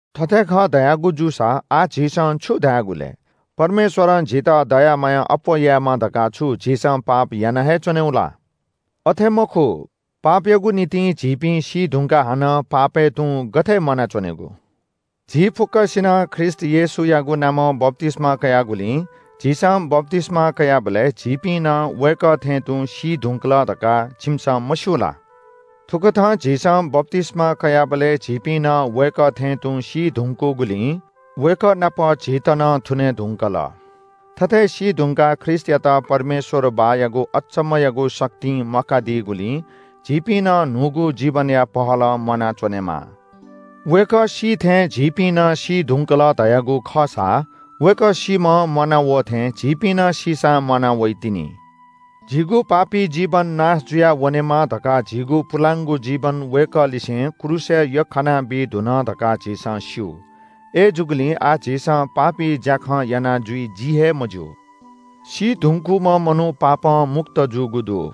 थथे खः धयागु जूसा आः झीसं छु धायेगु लय्? परमेश्‍वरं झीत दया माया अप्‍वः यायेमा धकाः छु झीसं पाप याना हे च्‍वनेगु ला? अथे मखु। पापयागु निंतिं झीपिं सीधुंकाः हानं पापय् तुं गथे म्‍वानाच्‍वनेगु? झी फुक्‍कसिनं ख्रीष्‍ट येशूयागु नामं बप्‍तिस्‍मा कयागुलिं झीसं बप्‍तिस्‍मा कयाबलय् झीपिं नं वय्‌कः थें तुं सी धुंकल धकाः छिमिसं मस्‍यू ला? थुकथं झीसं बप्‍तिस्‍मा कयाबलय् झीपिं नं वय्‌कः थें तुं सी धुंकूगुलिं वय्‌कः नाप झीत नं थुने धुंकल। थथे सीधुंकाः ख्रीष्‍टयात परमेश्‍वर बाःयागु अजू चाइपुगु शक्तिं म्‍वाकादीगुलिं झीपिं नं न्‍हूगु जीवनया पहलं म्‍वानाच्‍वनेमा। वय्‌कः सी थें झीपिं नं सी धुंकल धयागु खःसा वय्‌कः सीम्‍हं म्‍वाना वः थें झीपिं नं सीसां म्‍वाना वइतिनि। झीगु पापी जीवन नाश जुयावनेमा धकाः झीगु पुलांगु जीवन वय्‌कःलिसें क्रूसय् यख्‍खाना बी धुन धकाः झीसं स्‍यू। अय्‌जूगुलिं आः झीसं पापी ज्‍याखँ याना जुइ जि हे मज्‍यू। सी धुंकूम्‍ह मनू पापं मुक्त जूगु दु।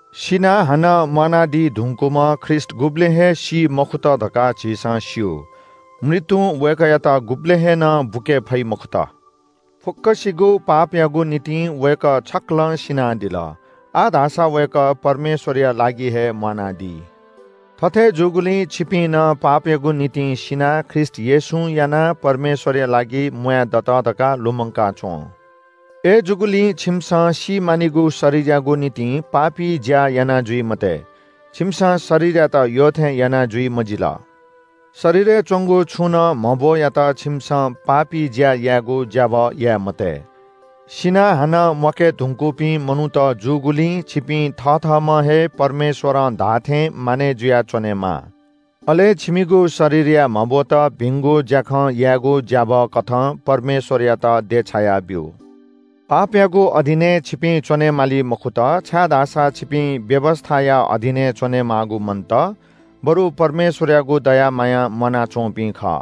सिनाः हानं म्‍वानादी धुंकूम्‍ह ख्रीष्‍ट गुबलें हे सी मखुत धकाः झीसं स्‍यू। मृत्‍युं वय्‌कःयात गुबलें हे नं बुके फइ मखुत। फुक्‍कसिगु पापयागु निंतिं वय्‌कः छक्‍कलं सिनादिल। आः धाःसा वय्‌कः परमेश्‍वरया लागि हे म्‍वानादी। थथे जूगुलिं छिपिं नं पापयागु निंतिं सिनाः ख्रीष्‍ट येशूं यानाः परमेश्‍वरया लागि म्‍वाय् दत धकाः लुमंका च्‍वँ। अय्‌जूगुलिं छिमिसं सी मानिगु शरीरयागु निंतिं पापी ज्‍या याना जुइ मते। छिमिसं शरीरयात यःथें याना जुइ मजिल। शरीरय् च्‍वंगु छुनं म्‍हब्‍वयात छिमिसं पापी ज्‍या यायेगु ज्‍याभः याये मते। सिनाः हानं म्‍वाके धुंकूपिं मनूत जूगुलिं छिपिं थथःम्‍ह हे परमेश्‍वरं धाःथें मानय् जुयाच्‍वनेमाः। अले छिमिगु शरीरया म्‍हब्‍वत भिंगु ज्‍याखँ यायेगु ज्‍याभःकथं परमेश्‍वरयात देछाया ब्‍यु। पापयागु अधीनय् छिपिं च्‍वनेमाली मखुत, छाय्‌धाःसा छिपिं व्‍यवस्‍थाया अधीनय् च्‍वनेमाःगु मन्‍त, बरु परमेश्‍वरयागु दया मायां म्‍वानाच्‍वंपिं खः।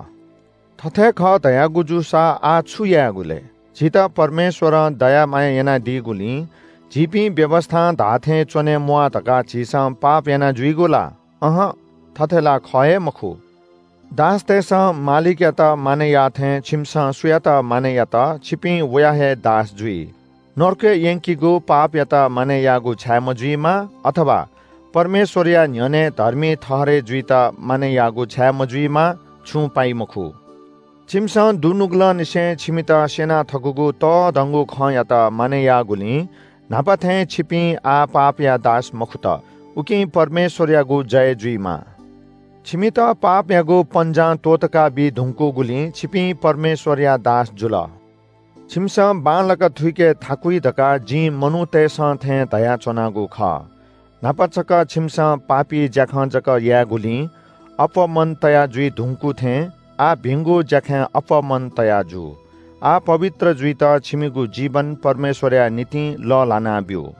थथे खः धयागु जूसा आः छु यायेगु लय्? झीत परमेश्‍वरं दया माया यानादीगुलिं झीपिं व्‍यवस्‍थां धाःथें च्‍वनेम्‍वाः धकाः झीसं पाप यानाजुइगु ला? अहं, थथे ला ख हे मखु। दासतय्‌सं मालिकयात मानय् याःथें छिमिसं सुयात मानय् यात छिपिं वया हे दास जुइ, नरकय् यंकीगु पापयात मानय् याःगु छाये मजुइमा, अथवा परमेश्‍वरया न्‍ह्यःने धर्मी ठहरय् जुइत मानय् याःगु छाये मजुइमा, छुं पाइ मखु। छिमिसं दुनुगलंनिसें छिमित स्‍यना थकूगु तःधंगु खँयात मानय् याःगुलिं न्‍हापा थें छिपिं आः पापया दास मखुत। उकिं परमेश्‍वरयागु जय जुइमा। छिमित पापयागु पन्‍जां त्‍वःतका बी धुंकूगुलिं छिपिं परमेश्‍वरया दास जुल। छिमिसं बांलाक थुइके थाकुइ धकाः जिं मनूतय्‌सं थें धयाच्‍वनागु खः। न्‍हापा छकः छिमिसं पापी ज्‍याखँ जक यायेगुलिं अप्‍वः मन तया जुइ धुंकू थें आः भिंगु ज्‍याखँय् अप्‍वः मन तया जु। आः पवित्र जुइत छिमिगु जीवन परमेश्‍वरया निंतिं लःल्‍हानाब्‍यु।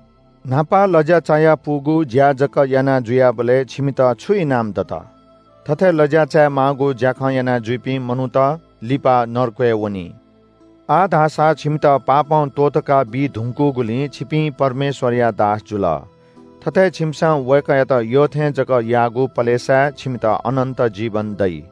न्‍हापा लज्‍या चायापुगु ज्‍या जक याना जुयाबलय् छिमित छु इनाम दत? थथे लज्‍या चायेमाःगु ज्‍याखँ यानाजुइपिं मनूत लिपा नरकय् वनी। आः धाःसा छिमित पापं त्‍वःतका बी धुंकूगुलिं छिपिं परमेश्‍वरया दास जुल। थथे छिमिसं वय्‌कःयात यःथें जक याःगु पलेसाय् छिमित अनन्‍त जीवन दइ।